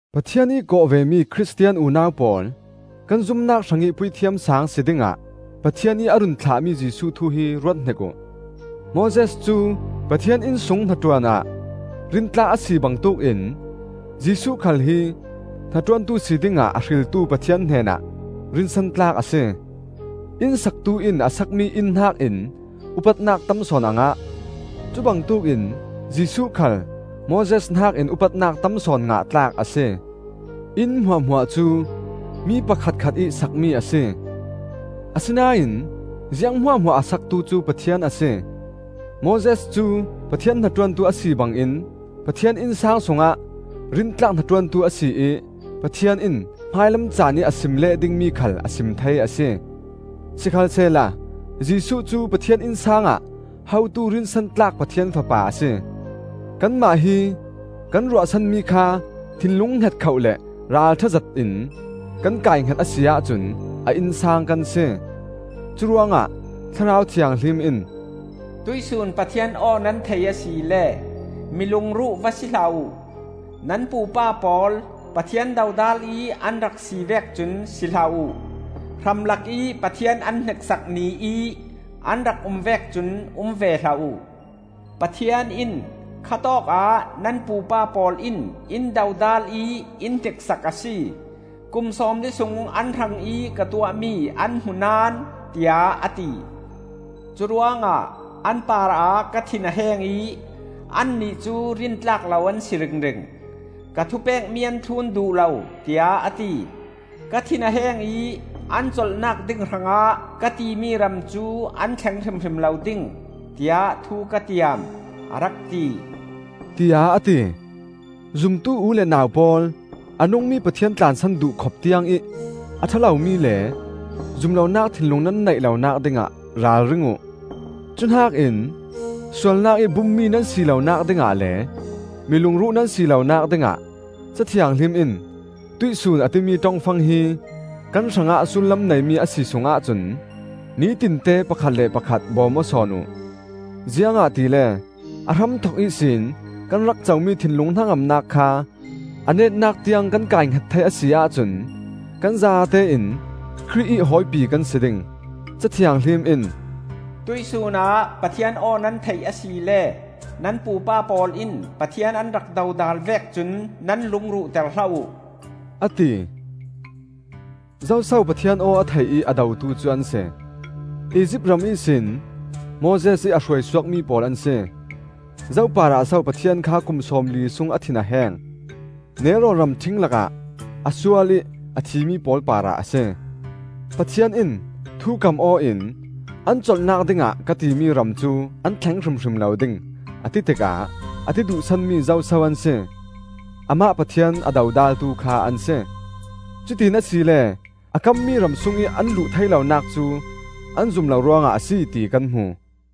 Pathian ih kawh vemi Khristian unau pawl, kan zumnak hrangih Puithiam Saang si dingah Pathian ih a run thlahmi Jesuh thu hi ruathnik uh! Moses cu Pathian inn sung hnaṭuan ah rintlak a si bangtuk in Jesuh khal hi hnaṭuantu si dingah a hriltu Pathian hnenah rinsan tlak a si. Inn saktu in a sakmi inn hnakin upatnak tam sawn a ngah. Cubangtuk in Jesuh khal Moses hnakin upatnak tam sawn ngah tlak a si. Inn hmuahhmuah cu mi pakhatkhatih sakmi a si; asinain ziang hmuahhmuah a saktu cu Pathian a si. Moses cu Pathian hnaṭuantu a si bangin Pathian innsang sungah rintlak hnaṭuantu a si ih Pathian in hmailam caanih a sim leh dingmi khal a sim thei a si. Sikhalsehla Jesuh cu Pathian innsang ah hotu rinsan tlak Pathian Fapa a si. Kanmah hi kan ruahsanmi kha thinlung hngetkhoh le ralṭha zetin kan kaihnget a si ahcun a innsang kan si. Curuangah Thlarau Thianghlim in, “Tuihsun Pathian aw nan thei asile, Mi lungruh va si hlah uh. Nan pupa pawl Pathian dodal ih an rak si vek cun si hlah uh; Hramlakih Pathian an hniksak Ni ih an rak um vek cun um ve hlah uh. Pathian in, ‘Kha tawkah nan pupa pawl in in dodal ih in hniksak a si; Kum sawmli sung an hrangih ka tuahmi an hmu naón,’ tiah a ti. Curuangah an parah ka thin a heng ih, ‘Annih cu rintlak lo an si ringring; Ka thupekmi an thlun duh lo,’ tiah a ti. Ka thin a heng ih, ‘An colhnak ding hrangah ka timi ram cu an thleng hrimhrim lo ding, tiah thu ka tiam,’ a rak ti,” tiah a ti. Zumtu u le nau pawl, a nungmi Pathian tlansan duh khop tiangih a ṭha lomi le, zum lonak thinlung nan neih lonak dingah ralring uh. Cuhnakin sualnak ih bummi nan si lonak dingah le mi lungruh nan si lonak dingah Ca Thianghlim in “Tuihsun,” a timi ṭongfang hi kan hrangah sullam neimi a si sung ahcun, nitinte pakhat le pakhat bawm aw sawn uh. Ziangahtile a hramthok ihsin kan rak comi thinlung hnangamnak kha a netnak tiang kan kaihnget thei a si ahcun kan zatein Khrih ih hawipi kan si ding. Ca Thianghlim in, “Tuih sunah, Pathian aw nan theih asile, Nan pupa pawl in Pathian an rak dodal vek cun nan lung ruhter hlah uh,” a ti. Zoso Pathian aw a thei ih a dotu cu an si? Izipt ram ihsin Moses ih a hruaisuakmi pawl an si. Zo parah so Pathian kha kum sawmli sung a thin a heng? Nelrawn ramṭhing lakah a sual ih a thimi pawl parah a si. Pathian in thu kam-aw in, “An colhnak dingah ka timi ram cu an thleng hrimhrim lo ding,” a ti tikah a ti duh sanmi zo so an si? Amah Pathian a dodaltu kha an si. Cutiin asile a kammi ram sungih an luh thei lonak cu an zum lo ruangah a si, ti kan hmu.